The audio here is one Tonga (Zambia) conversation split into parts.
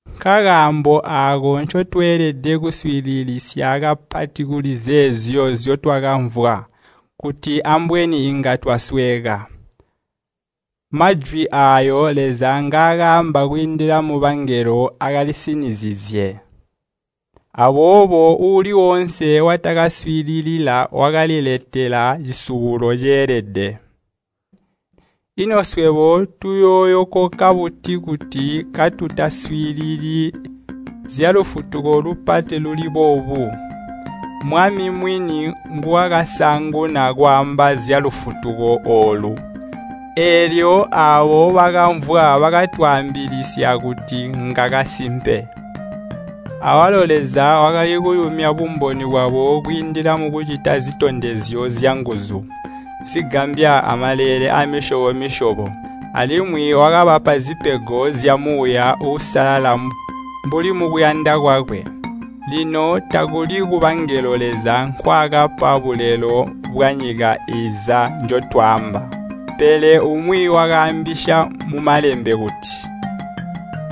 Nkakaambo aako ncotweelede kuswiililisya kapati kuli zeezyo nzyotwakamvwa, kuti ambweni inga twasweeka. Majwi aayo Leza ngakaamba kwiindila mubangelo akalisinizizye. Aboobo uuli woonse watakaaswiilila wakaliletela cisubulo ceelede. Ino swebo tuyooyokoka buti kuti katutaswiilili zyalufutuko lupati luli boobu? Mwami, mwini nguwakasaanguna kwaamba zyalufutuko oolu, eelyo aabo bakamvwa bakatwaambilisya kuti ngakasimpe. Awalo Leza wakali kuyumya bumboni bwabo kwiindila mukucita zitondezyo zyanguzu, zigambya amaleele aamisyobo-misyobo. Alimwi wakabapa zipego zya Muuya Uusalala mbuli mukuyanda kwakwe. Lino takuli kubangelo Leza nkwaakapa bulelo bwanyika iiza njotwaamba. Pele umwi wakaambisya mu Malembe kuti,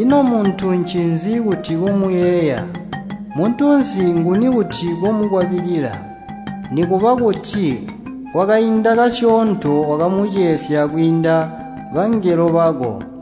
“Ino muntu ncinzi kuti komuyeeya, muntunsi nguni kuti komukwabilila? Nikuba kuti kwakaindi kasyoonto wakamucesya kwiinda bangelo bako,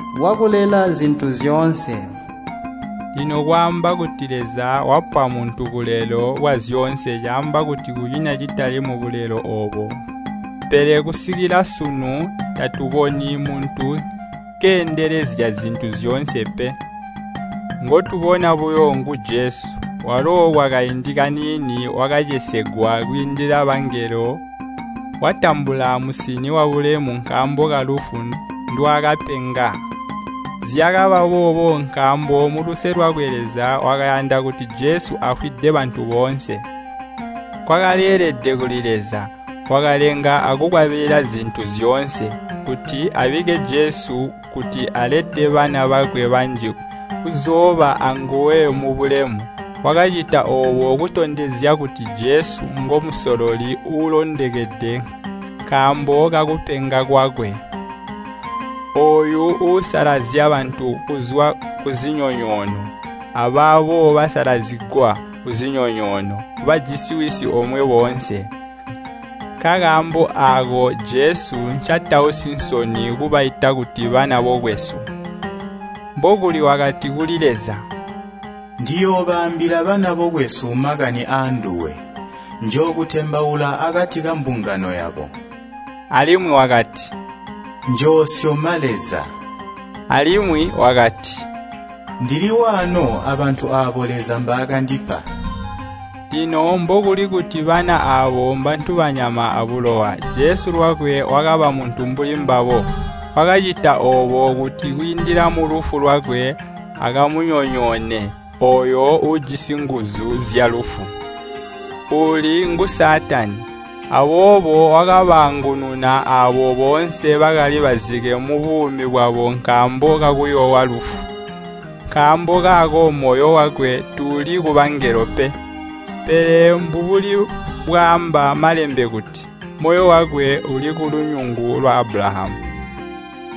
bwakulela zintu zyoonse.” Lino kwaamba kuti Leza wapa muntu bulelo bwazyoonse caamba kuti kunyina citali mubulelo oobo. Pele kusikila sunu tatuboni muntu keendelezya zintu zyoonse pe. Ngotubona buyo ngu Jesu, walo kwakaindi kaniini wakacesegwa kwiinda bangelo, watambula musini wabulemu nkaambo kalufu ndwaakapenga. Zyakaba boobo nkaambo muluse lwakwe Leza wakayanda kuti Jesu afwide bantu boonse. Kwakaleelede kuli Leza, wakalenga akukwabilila zintu zyoonse, kuti abikke Jesu kuti alete bana bakwe banji kuzooba aanguwe mubulemu. Wakacita oobo kutondezya kuti Jesu ngo Musololi uulondokede nkaambo kakupenga kwakwe. Ooyo uusalazya bantu kuzwa ku zinyonyoono, abaabo basalazigwa kuzinyonyoono, bajisi Wisi omwe boonse. Nkakaambo aako Jesu ncatausi nsoni kubaita kuti bana bokwesu. Mbokuli wakati kuli Leza, “Ndiyoobaambila bana bokwesu makani aanduwe. Njookutembaula akati kambungano yabo.” Alimwi wakati, “Njoosyoma Leza.” Alimwi wakati, “Ndili waano abantu aabo Leza mbaakandipa.” Lino mbokuli kuti bana aabo mbantu banyama abulowa, Jesu lwakwe wakaba muntu mbuli mbabo. Wakacita oobo kuti kwiindila mulufu lwakwe akamunyonyoone ooyo uujisi nguzu zyalufu, uuli ngu Saatani. Aboobo wakabaangununa aabo boonse bakali bazike mubuumi bwabo nkaambo kakuyoowa lufu. Nkaambo kaako moyo wakwe tuuli kubangelo pe. Pele mbubuli bwaamba Malembe kuti, “Moyo wakwe uli kulunyungu lwa Abulahamu.”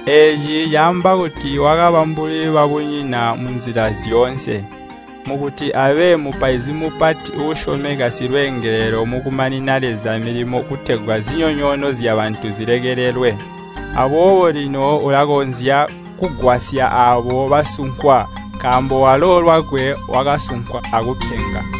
Eeci caamba kuti wakaba mbuli babunyina munzila zyoonse, mukuti abe Mupaizi Mupati uusyomeka silweengelelo mukumanina Leza milimo kutegwa zinyonyoono zyabantu zilekelelwe. Aboobo lino ulakonzya kugwasya aabo basunkwa, nkaambo walo lwakwe wakasunkwa akupenga.